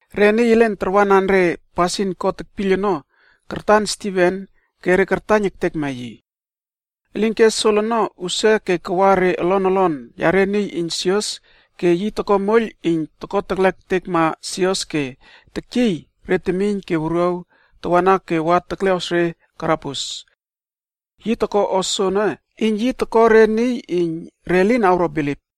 Re niy elen tarwanan re pasin God tekpiyl ono kartan Stiven ke re kartaiyn ektekma yi. Elinke Sol ono usia ke kawa re olon olon yare niy iyn sios ke yi toko moiyl iyn toko teklekma sios ke tekyiy re temiyn ke wuruaw tawana ke wa tekleꞌos re karabus. Yi toko o soene iyn yi toko re niy iyn re lin awro bilip.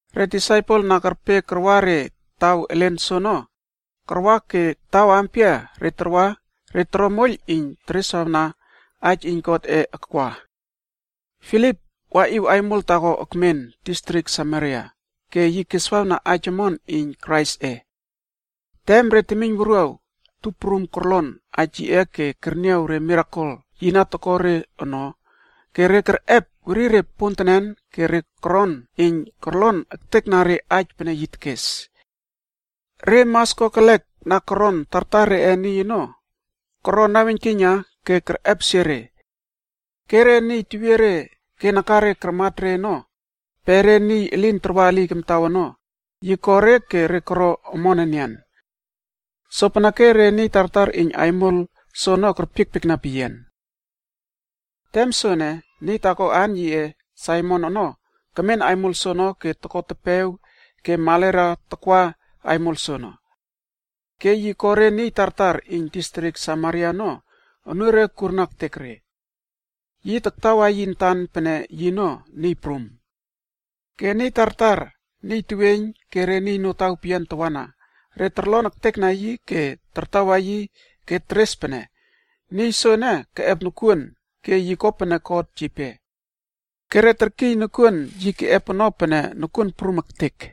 Re disaipel na kerpe karwa re taw elen soono, karwa ke taw ampia re tarwa re toro moiyl iyn tereswawna aij iyn Godꞌe akwa. Filip waꞌiw aimol taako ekmen distrik Samaria ke yi keswawna aij omon iyn Kraisꞌe. Tem re temiyn wuruaw tup prum korlon aij yiꞌe ke kerniaw re mirakel yi na toko re ono, ke re kerꞌep werire pontenen ke re koron iyn korlon ektekna re aij pene yi tekes. Re mas kokelek na kermen tartar reꞌe niy ono, koro naweiynkiyna ke kerꞌepesie re. Ke re niy tewiere ke nakare karmat re ono, pe niy elin tarwa eliy kamtaw ono, yi ko re ke re koro omon enian. Sopeneke re niy tartar iyn aimol soono kerpiekpiekna peyian. Tem soene, niy taako aan yiꞌe Saimon ono kemen aimol soono ke toko tepew ke marela takwawa aimol soono. Ke yi ko re niy tartar iyn distrik Samaria ono unure kurna ektek re. Yi taktawa yi antan pene yino niy prum. Ke re niy tartar, niy teweiyn ke re niy notaw peyian tawana, re korlon ektekna yi ke tartawa yi ke teres pene, “Niy soene keꞌep nokuon ke yi ko pene God yipe. Ke re terkiy nokuon yi keꞌep ono pene Nokuon Prum Ektek.”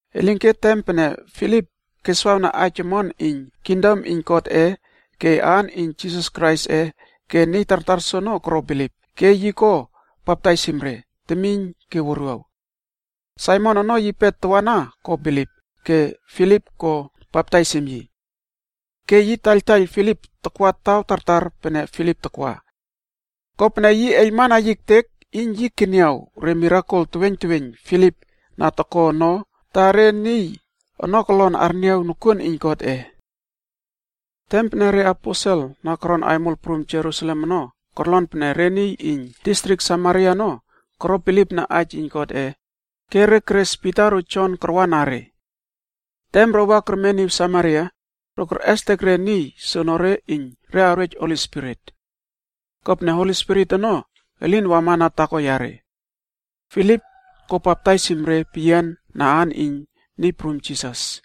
Elinke tem pene Filip keswawna aij omon iyn kingdom iyn Godꞌe ke aan iyn Jisas Kraisꞌe ke niy tartar soono koro bilip, ke yi ko baptaisim re, temiyn ke wuruaw. Saimon ono yipe tawana ko bilip, ke Filip ko baptaisim yi. Ke yi taktaiyl Filip takwa taw tartar pene Filip takwa. Kopene yi eiylmana ektek yi iyn yi keniaw re mirakel teweiyn teweiyn Filip na toko ono ta re niy ono kolon arniaw nokuon iyn Godꞌe. Tem pene re aposel na koron aimol prum Jerusalem ono korlon pene re niy iyn distrik Samaria ono koro bilipna aij iyn Godꞌe, ke re keres Pita ro Jon karwa na re. Tem ro wa kermeniw Samaria, ro kerꞌestek re niy soonore iyn re awrej Holi Spirit. Kopene Holi Spirit ono elin wamana taako yare. Filip ko baptaisim re peyian na aan iyn Niy Prum Jisas.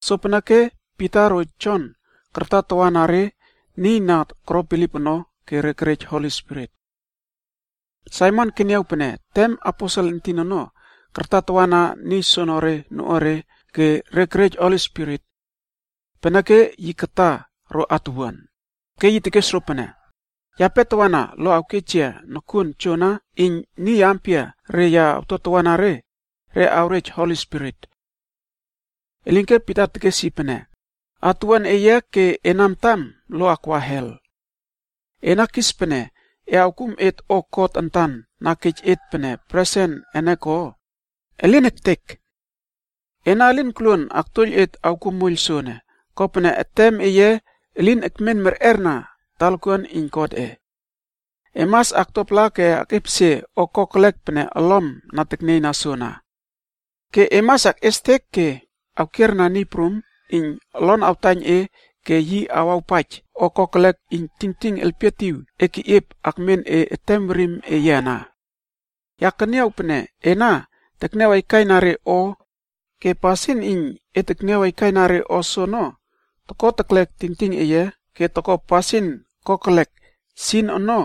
Sopeneke Pita ro Jon kartatawana re niy na koro bilip ono, ke re kerej Holi Spirit. Saimon keniaw pene tem aposel entin ono kartatawana niy soonore noꞌuare ke re kerej Holi Spirit. Peneke yi kata ro atuwuan, ke yi tekes ro pene, “Yape tawana lo awkej yia nokuon joana iyn niy ampiare ya awtotawana re, re awrej Holi Spirit.” Elinke Pita tekes yi pene, “Atowuan eye ke ena antam lo akwa hel. Ena kis pene e awkum et o God antan na kej et pene presen ene ko? Elin ektek! Ena elin koluon aktuoiyl et awkuo moiyl soene, kopene etem eye elin ekmen merꞌer na talakuan iyn Godꞌe. E mas aktuapala ke ekꞌepesie o kokelek pene olom na teknieyna soana. Ke e mas akꞌiestek ke awkierna Niy Prum iyn olon awtaiyn e ke yi awawpaij o kokelek iyn tingting elpietiw e keꞌiep akmen e etem werim eye ana. Ya keniaw pene ena tekniaw aikaina re o ke pasin iyn e tekniaw aikaina re o soono toko telek tingting eye ke toko pasin kokelek ono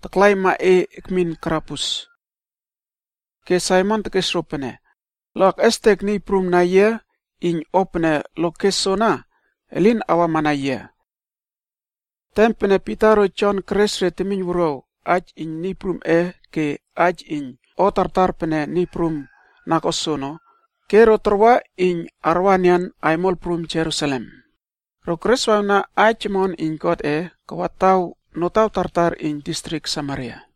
taklaima e ekmin karabus.” Ke Saimon tekes ro pene, “Lo akꞌestek Niy Prum na yia iyn o pene lo kes soana elin awama na yia.” Tem pene Pita ro Jon keres re temiyn wuruaw aij iyn Niy Prumꞌe ke aij iyn o tartar pene Niy prum na ko soono, ke ro tarwa iyn arwa enian aimol prum Jerusalem, ro kereswawna aij omon iyn Godꞌe kawa taw notaw tartar iyn distrik Samaria.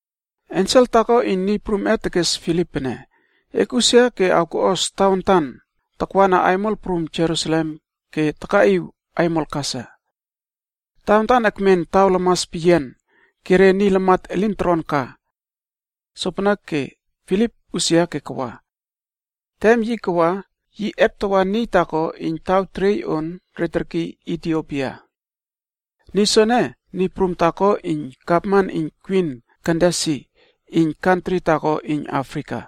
Ensel taako iyn Niy Prum tekes Filip pene, “Ekꞌusia ke awkoꞌos tawantan takama aimol prum Jerusalem ke takaꞌiw aimol Gasa.” Tawantan ekmen taw lamas peyian ke re niy lamat elin toron ka. Sopeneke Filip usia ke kawa. Tem yi kawa yi eptawa niy taako iyn taw teriey on re terkiy Itiopia. Niy soene, niy prum taako iyn gavman iyn kwin Kandasi iyn kantri taako iyn Afrika.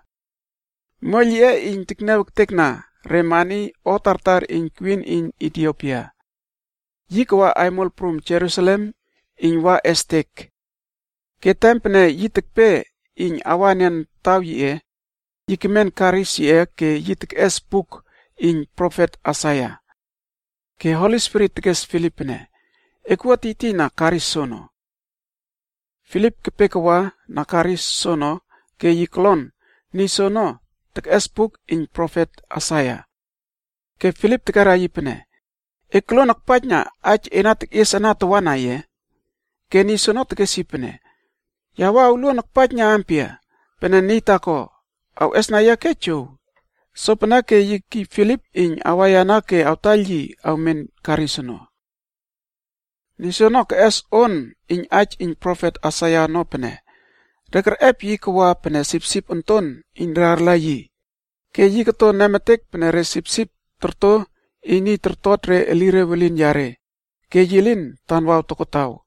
Moiyl yiꞌe iyn tekniaw ektekna re mani o tartar iyn Kwin iyn Itiopia.a Yi kawa aimol prum Jerusalem iyn wa estek. Ke tem pene yi tekpe iyn awa enian taw yiꞌe, yi kemen karisb yiꞌe ke yi tekꞌes buk iyn profet Aisaia. Ke Holi Spirit tekes Filip pene, “Ekwua tiytiyna karis soono.” Filip kepe kawa na karis soono ke yi kolon niy soono tekꞌes buk iyn profet Aisaia. Ke Filip tekera yi pene, “E tokluon akpaijna aij e na tekꞌies ana tawana ye?” Ke niy soono tekes yi pene, “Ya wua awluon akpaijna ampia? Pene niy taako awes oktow yia ke jow.” Sopeneke yi kekiy Filip iyn awaiyana ke awtaiyl yi awmen karis ono. Niy soono keꞌes on iyn aij iyn profet Aisaia ono pene, “Re kerꞌep yi kawa pene sipsip onton iyn re arla yi, ke yi koto nemetek pene re sipsip torto iyn niy toktot re elire welin yare, ke yi lin tanwaw tokotaw.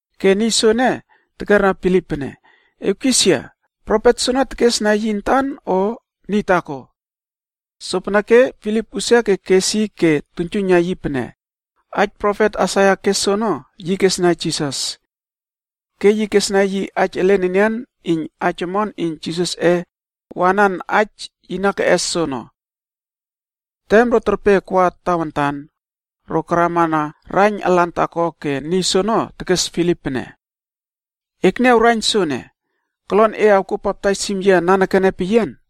Ke niy soono tekera Filip pene, “E awkis yia, profet soene tekesna yi antan o niy taako?” Sopeneke Filip usia ke kes yi ke tuiynjuiyna yi pene, aij profet Aisaia kes soono, yi kesna Jisas. Ke yi kesna yi aij elen enian iyn aij omon iyn Jisasꞌe awanan aij yi na keꞌes soono. Tem ro terpe akwa tawantan, ro karama na raiyn alan taako ke niy soono tekes Filip pene, “Ekniaw raiyn soene, kolon e awkuo baptaisim yia nanekene peyian?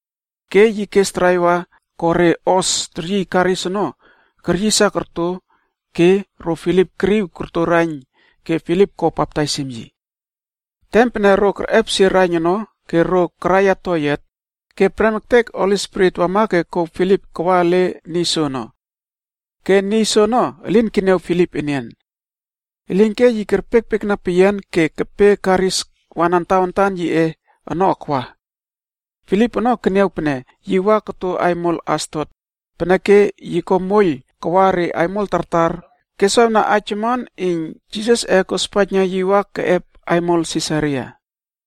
Ke yi kes draiva ko re hos teryiy karis ono keryisa korto ke ro Filip keriw korto raiyn ke Filip ko baptaisim yi. Tem pene ro kerꞌepesie raiyn ono ke ro karaiya toyiat, ke prem ektek Spirit iyn Niy Prum wama ke kouw Filip kawa ele niy soono. Ke niy soono elin keniaw Filip enian. Elinke yi kerpiekpiekna peyian ke yi kepe karis wanan tawantan yiꞌe ono kawa. Filip ono keniaw pene yi wa koto aimol Asdot, peneke yi ko moiyl kawa re aimol tartar keswawna aij omon iyn Jisasꞌe kospaijna yi wa keꞌep aimol Sisaria.